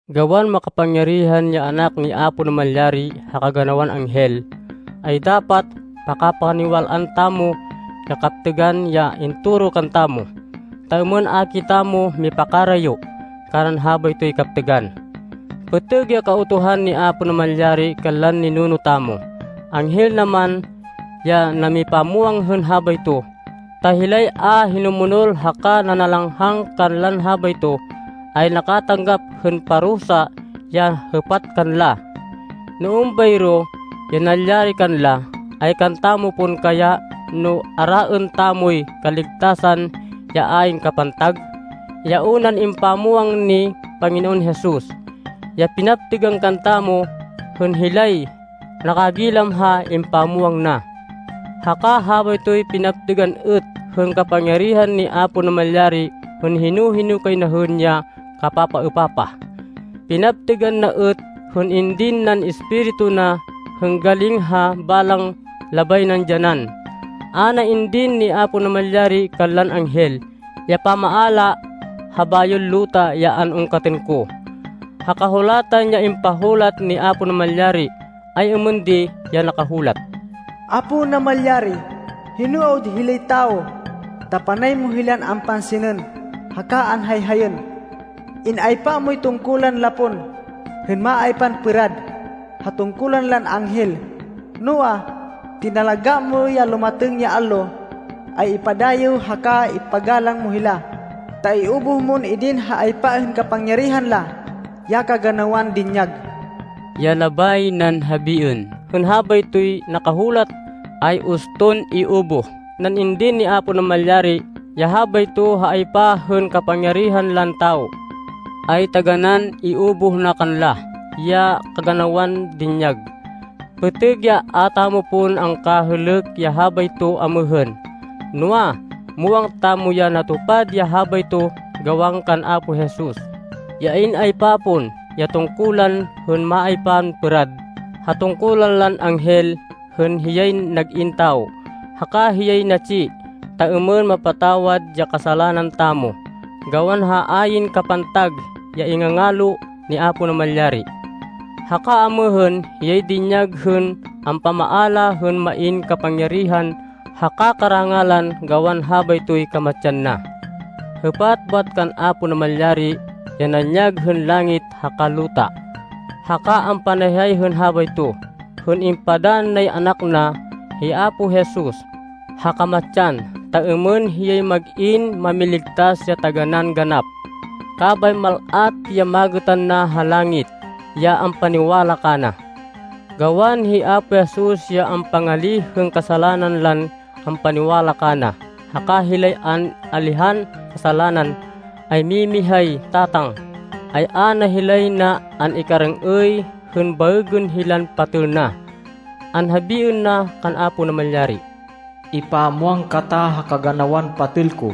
Gawan makapangyarihan ya Anak ni Apo Namalyari ha kaganawan anghel, ay dapat pakapaniwal-an tamo ya kaptêgan ya intoro kantamo, ta êmên a kitamo mipakarayo kanan habaytoy kaptêgan. Pêtêg ya Kautuhan ni Apo Namalyari kanlan ninuno tamo, anghel na man ya namipamwang hên habayto, ta hilay a hinumonol haka nanalanghang kanlan habayto, ay nakatanggap hên parusa ya hêpat kanla. No êmbayro ya nalyari kanla, ay kantamo pon kaya no araên tamoy kaligtasan ya ayn kapantag, ya unan impamwang ni Panginoon Jesus, ya pinaptêgan kantamo hên hilay nakagilam ha impamwang na. Haka habaytoy pinaptêgan êt hên kapangyarihan ni Apo Namalyari hên hino-hino kay na hên ya kapapaêpapah. Pinaptêgan na êt hên indin nan Espiritu na hên galing ha balang labay nan dyanan. A na indin ni Apo Namalyari kanlan anghel ya pamaala ha bayon luta ya an-ungkatên ko. Ha Kahulatan ya impahulat ni Apo Namalyari, ay êmên di ya nakahulat, “Apo Namalyari, hino awud hilay tawo ta panay mo hilan ampansinên haka anhayhayên? In-aypa moy tungkulan la pon, hên maaypan pêrad ha tungkulan lan anghel. Noa, tinalagá mo ya lumatêng ya allo ay ipadayêw haka ipagalang mo hila, ta iubuh mon idin ha aypa hên kapangyarihan la ya kaganawan dinyag.” Ya labay nan habiên hên habaytoy nakahulat, ay uston iubuh nan idin ni Apo Namalyari ya habayto ha aypa hên kapangyarihan lan tawo, ay taganán iubuh na kanla ya kaganawan dinyag. Pêtêg ya a tamo pon angkahêlêk ya habayto amêhên. Noa, muwang tamo ya natupad ya habayto gawan kan Apo Jesus, ya in-aypa pon ya tungkulan hên maaypan pêrad ha tungkulan lan anghel hên hiyay nag-in tawo, haka hiyay natsi ta êmên mapatawad ya kasalanan tamo, gawan ha ayn kapantag ya ingangalo ni Apo Namalyari. Haka amêhên hiyay dinyag hên ampamaala hên main kapangyarihan haka karangalan gawan habaytoy kamatsan na. Hêpat bat kan Apo Namalyari, ya nanyag hên langit haka luta, haka ampanayhay hên habayto, hên ipadann nay Anak na, hi Apo Jesus, ha kamatsan ta êmên hiyay mag-in Mámiligtas ya taganán ganap. Kabay mal-at ya magêtan na ha langit, ya ampaniwala kana. Gawan hi Apo Jesus ya ampangalíh hên kasalanan lan ampaniwala kana haka hilay an-alihan kasalanan, ay mimihay Tatang, ay a na hilay na an-ikarêng-êy hên baêgên hilan patêl na. Anhabiên na kan Apo Namalyari, “Ipamwang kata ha kaganawan patêl ko,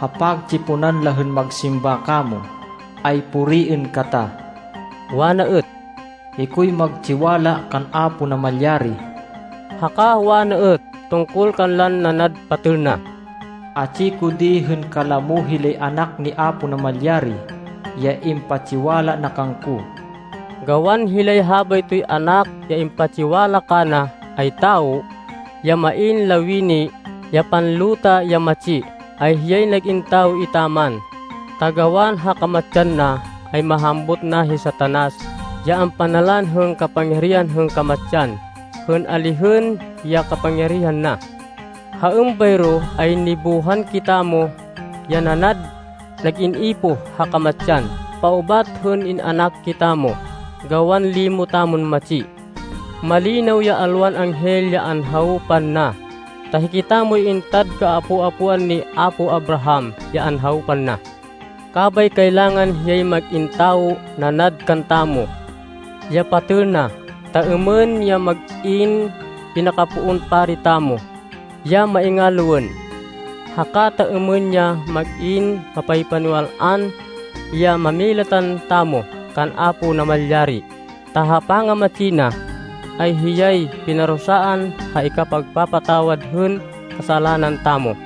ha pagtsiponan la hên magsimba kamo, ay puriên kata!” Wana êt, “Hikoy magtsiwala kan Apo Namalyari.” Haka wana êt tungkol kanlan nanad patêl na, “Atsi ko di hên kalamo hilay anak ni Apo Namalyari ya impatsiwala na kangko.” Gawan hilay habaytoy anak ya impatsiwala kana ay tawo, ya main lawini ya panluta ya matsi, ay hiyay nag-in tawo etaman, ta gawan ha kamatsan na, ay mahambut na hi Satanas ya ampanalan hên kapangyarihan hên kamatsan, hên alihên ya kapangyarihan na. Ha êmbayro ay nibuhan kitamo ya nanad nag-in ipoh ha kamatsan paubat hên in-anak kitamo, gawan limo tamon matsi. Malinaw ya alwan anghel ya anhawpan na, ta hikitamoy intad kaapo-apoan ni apo Abraham ya anhawpan na. Kabay kailangan hiyay mag-in tawo nanad kantamo, ya patêl na, ta êmên ya mag-in pinakapoon pari tamo, ya maingaloên. Haka ta êmên ya mag-in mapaypaniwal-an ya mámilatan tamo kan Apo Namalyari. Ta ha pangamatsi na, ay hiyay pinarusaan ha ikapagpapatawad hên kasalanan tamo.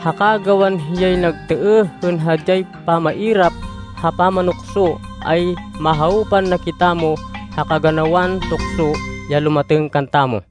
Haka gawan hiyay nagtêêh hên hadyay pamairap ha pamanukso, ay mahawpan na kitamo ha kaganawan tukso ya lumatêng kantamo.